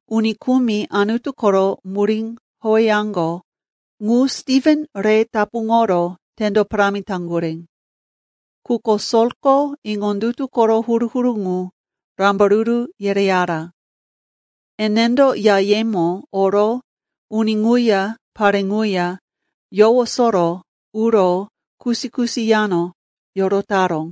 Uni kumi Anutu koro murí howeyaŋgo ŋu Stiven re tapuŋoro tendo parámi taŋgurí. Quko Solko iŋondutu koro huru-huru ŋu rambaruru yereyara. Enendo yayemo oro uni ŋuya pare ŋuya yowosoro uro kusi-kusi yano yorotaró.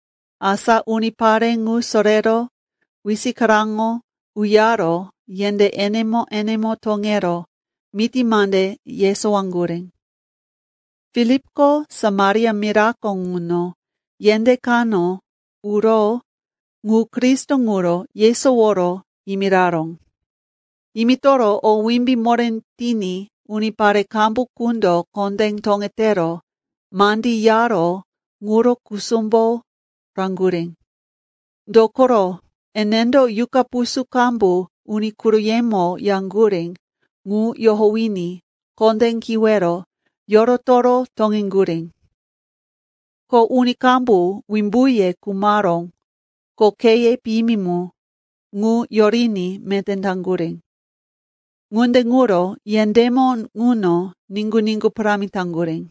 Asa unipare ŋu sorero wisikaraŋo uyaro yendé enemo-enemo toŋero miti mande yesowaŋgurí. Filipko Samaria mirako ŋuno yendé kano uro ŋu Kristo ŋuro yesoworo yimiraró. Yimitoro o wimbí moré tiní unipare qambu qundo kondé toŋetero mandí yaró ŋuro kusumbo raŋgurí. Dokoro enendo yuqa pusú qambu uni quroyemo yaŋgurí ŋu yohowiní kondé kiwero yorotoro toŋeŋgurí. Ko uni qambu wimbuye khumaró, ko kheye piyimi mu, ŋu yoriní meté taŋgurí. Ŋunde ŋuro yendémo ŋuno niŋgu-niŋgu parámi taŋgurí.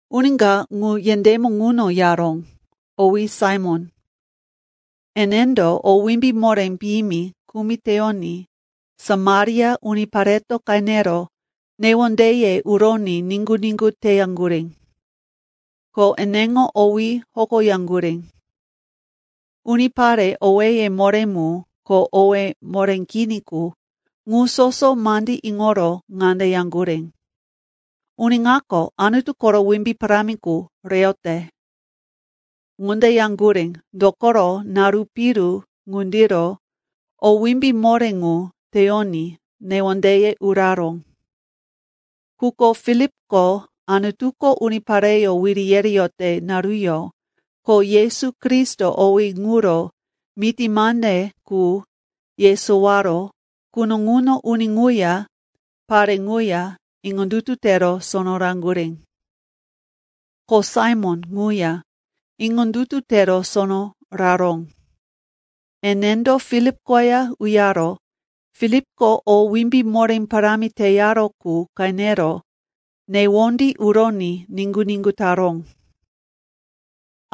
Uni ka ŋu yendémo ŋuno yaró, owí Saimon. Enendo o wimbí moré piyimi kumi teyoní Samaria unipareto qenero newondeye uroní niŋgu-niŋgu teyaŋgurí. Ko eneŋo owí hokoyaŋgurí. Unipare owéye moré mu ko owéye moré kini qu ŋu soso mandí iŋoro ŋande yaŋgurí, “Uni ŋako Anutu koro wimbí parámi qu reyote.” Ŋunde yaŋgurí, dokoro naru piru ŋundiro o wimbí moré ŋu teyoní newondeye uraró. Quko Filipko Anutuko unipareyó wiri yereyote naruyó ko Yesu Kristo owí ŋuro miti mande qu yesowaró quno ŋuno uni ŋuya pare ŋuya iŋondutu tero sono raŋgurí. Ko Saimon ŋuya iŋondutu tero sono raró. Enendo Filip koya uyaro Filipko o wimbí moré parámi teyaró qu qenero newondí uroní niŋgu-niŋgu taró.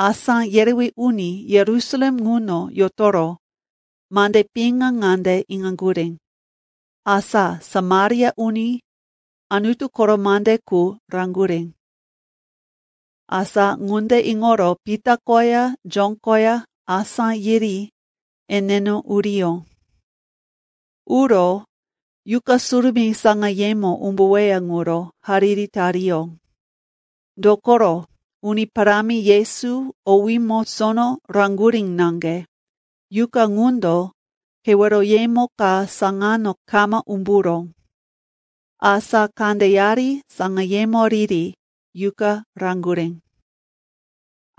Asá yerewí uni Yerusalem ŋuno yotoro mande piŋa ŋande iŋaŋgurí, asa Samaria uni Anutu koro mande qu raŋgurí. Asa ŋunde iŋoro Pita koya Jon koya asá yiri eneno uriyó. Uro Yuqa Surumí saŋayemo umbuweya ŋuro hariri tariyó. Dokoro Uni Parámi Yesu owímo sono raŋgurí naŋge, Yuqa ŋundo keweroyemo ka saŋano kama umburó. Asa kandeyari saŋayemo riri, Yuqa raŋgurí.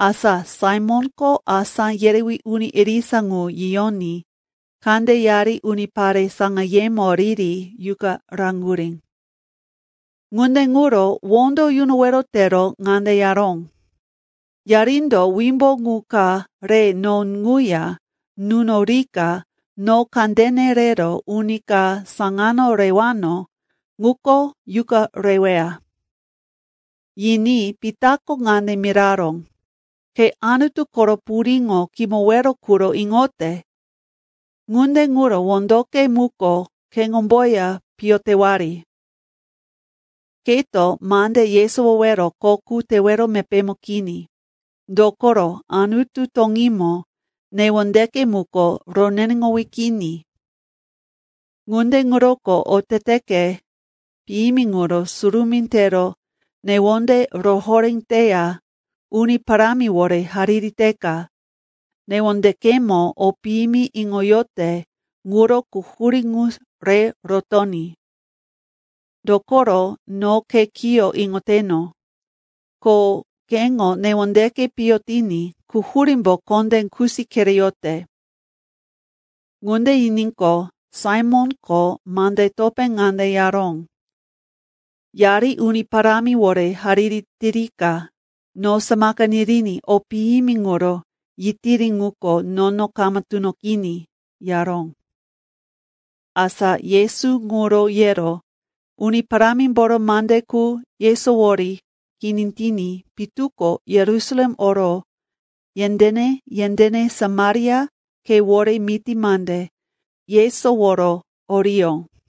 Asa Saimonko asá yerewí uni irisa ŋu yiyoní kandeyari unipare saŋayemo riri Yuqa raŋgurí. Ŋunde ŋuro wondo yunowero tero ŋande yaró, “Yarindo wimbu ŋu ka re no ŋuya nunorika no kandene rero uni ka saŋano rewano ŋuko Yuqa reweya.” Yiní Pitako ŋande miraró, “Ke Anutu koro puriŋo kimowero quro iŋote! Ŋunde ŋuro wondoke muko keŋomboya piyo tewari! Keto mande yesowowero kho qu tewero mepémo kini, dokoro Anutu toŋímo newondeke muko roneneŋowí kini. Ŋunde ŋuroko oteteke piyimi ŋuro surumí tero newonde rohoré teya Uni Parámiwore hariri teka newondekemo o piyimi iŋoyote ŋuro quhurí ŋu re rotoní. Dokoro no ke kiyo iŋoteno, ko keŋo newondeke piyo tiní quhurímbo kondé kusi kereyote.” Ŋunde yiníqo, Saimonko mande topé ŋande yaró, “Yari Uni Parámiwore hariri tirika no samaka niriní o piyimi ŋuro yitiri ŋuko nono kama tunoqiní,” yaró. Asa Yesu ŋuro yero Uni Parámimboro mande qu yesowori kini tiní pitu ko Yerusalem oro yendéne-yendéne Samaria khewore miti mande yesoworo oriyó.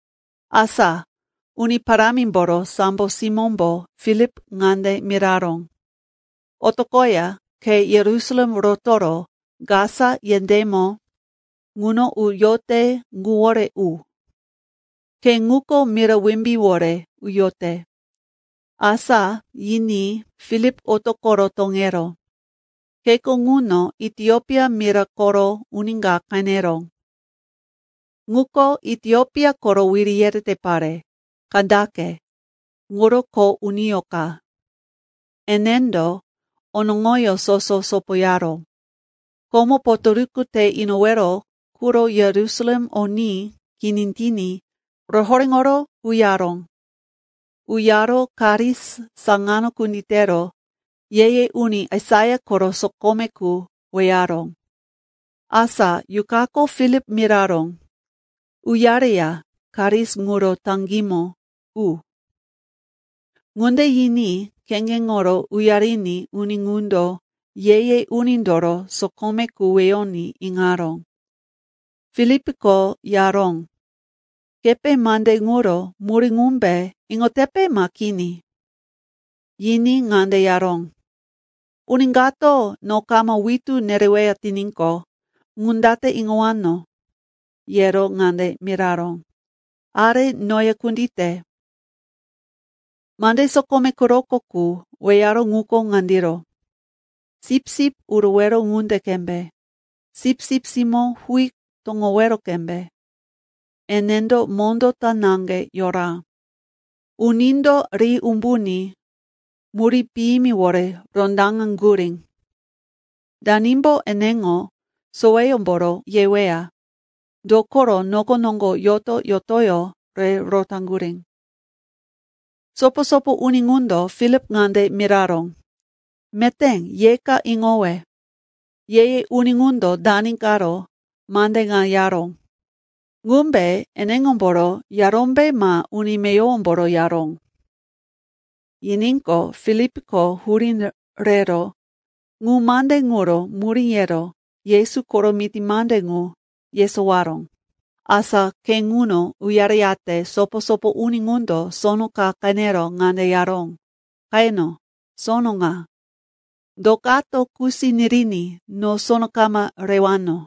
Asa Uni Parámimboro sambo simómbo Filip ŋande miraró, “Otoqoya khe Yerusalem rotoro Gasa yendémo ŋuno uyote ŋuwore u.” Khe ŋuko mira wimbíwore uyote. Asa yiní Filip otoqoro toŋeró. Kheko ŋuno Itiopia mira koro uni ka qeneró. Ŋuko Itiopia koro wiri yerete pare, Kandake, ŋuro kho uniyó ka. Enendo onoŋoyó soso sopoyaró. Komo potoruku te inowero quro Yerusalem oní kini tiní rohoréŋoro uyaró. Uyaro karis saŋano kunditero ye-ye uni Aisaia koro sokome qu weyaró. Asa Yuqako Filip miraró, “Uyareya karis ŋuro taŋgímo u.” Ŋunde yiní kheŋgeŋoro uyariní uni ŋundo ye-ye unindoro sokome qu weyoní iŋaró. Filipko yaró, “Kepe mande ŋuro murí ŋumbe iŋotepe ma kini?” Yiní ŋande yaró, “Uni kato no kama witú nereweya tiníqo, ŋu date iŋowano?” yero ŋande miraró, “Are noya kundite.” Mande sokome quroko qu weyaró ŋuko ŋandiro, “Sipsip urowero ŋunde qembe, sipsip simó huí toŋowero qembe, enendo mondó ta naŋge yora. Unindo ri umbuní murí piyimiwore rondaŋaŋgurí. Danimbo eneŋo soweyómboro yeweya? Dokoro noko noŋgo yoto-yotoyó re rotaŋgurí.” Sopo-sopo uni ŋundo Filip ŋande miraró, “Meté, yeka iŋowe. Ye-ye uni ŋundo dani karo mande ŋa yaró? Ŋumbe eneŋomboro yarómbe ma uni meyowomboro yaró?” Yiníqo, Filipko hurí rero ŋu mande ŋuro murí yero Yesu koro miti mande ŋu yesowaró. Asa khe ŋuno uyareyate sopo-sopo uni ŋundo sono ka qenero ŋande yaró, “Qeno, sono ŋa. Do kato kusi niriní no sono kama rewano?”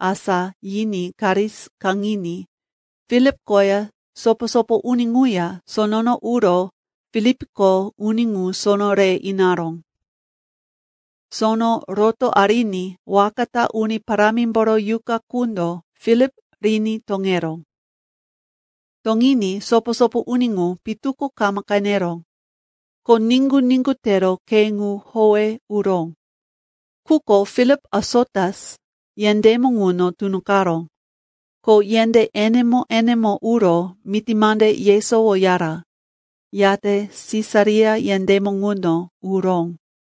Asa, yiní karis kaŋiní Filip koya sopo-sopo uni ŋuya sonono uro Filipko uni ŋu sono re inaró. Sono roto ariní waka ta Uni Parámimboro Yuqa qundo Filip riní toŋeró. Toŋiní sopo-sopo uni ŋu pitu ko kama qeneró. Ko niŋgu-niŋgu tero khe ŋu howe uró. Quko Filip Asotus yendémo ŋuno tunoqaró. Ko yendé enemo-enemo uro miti mande yesowoyara, yate Sisaria yendémo ŋuno uró.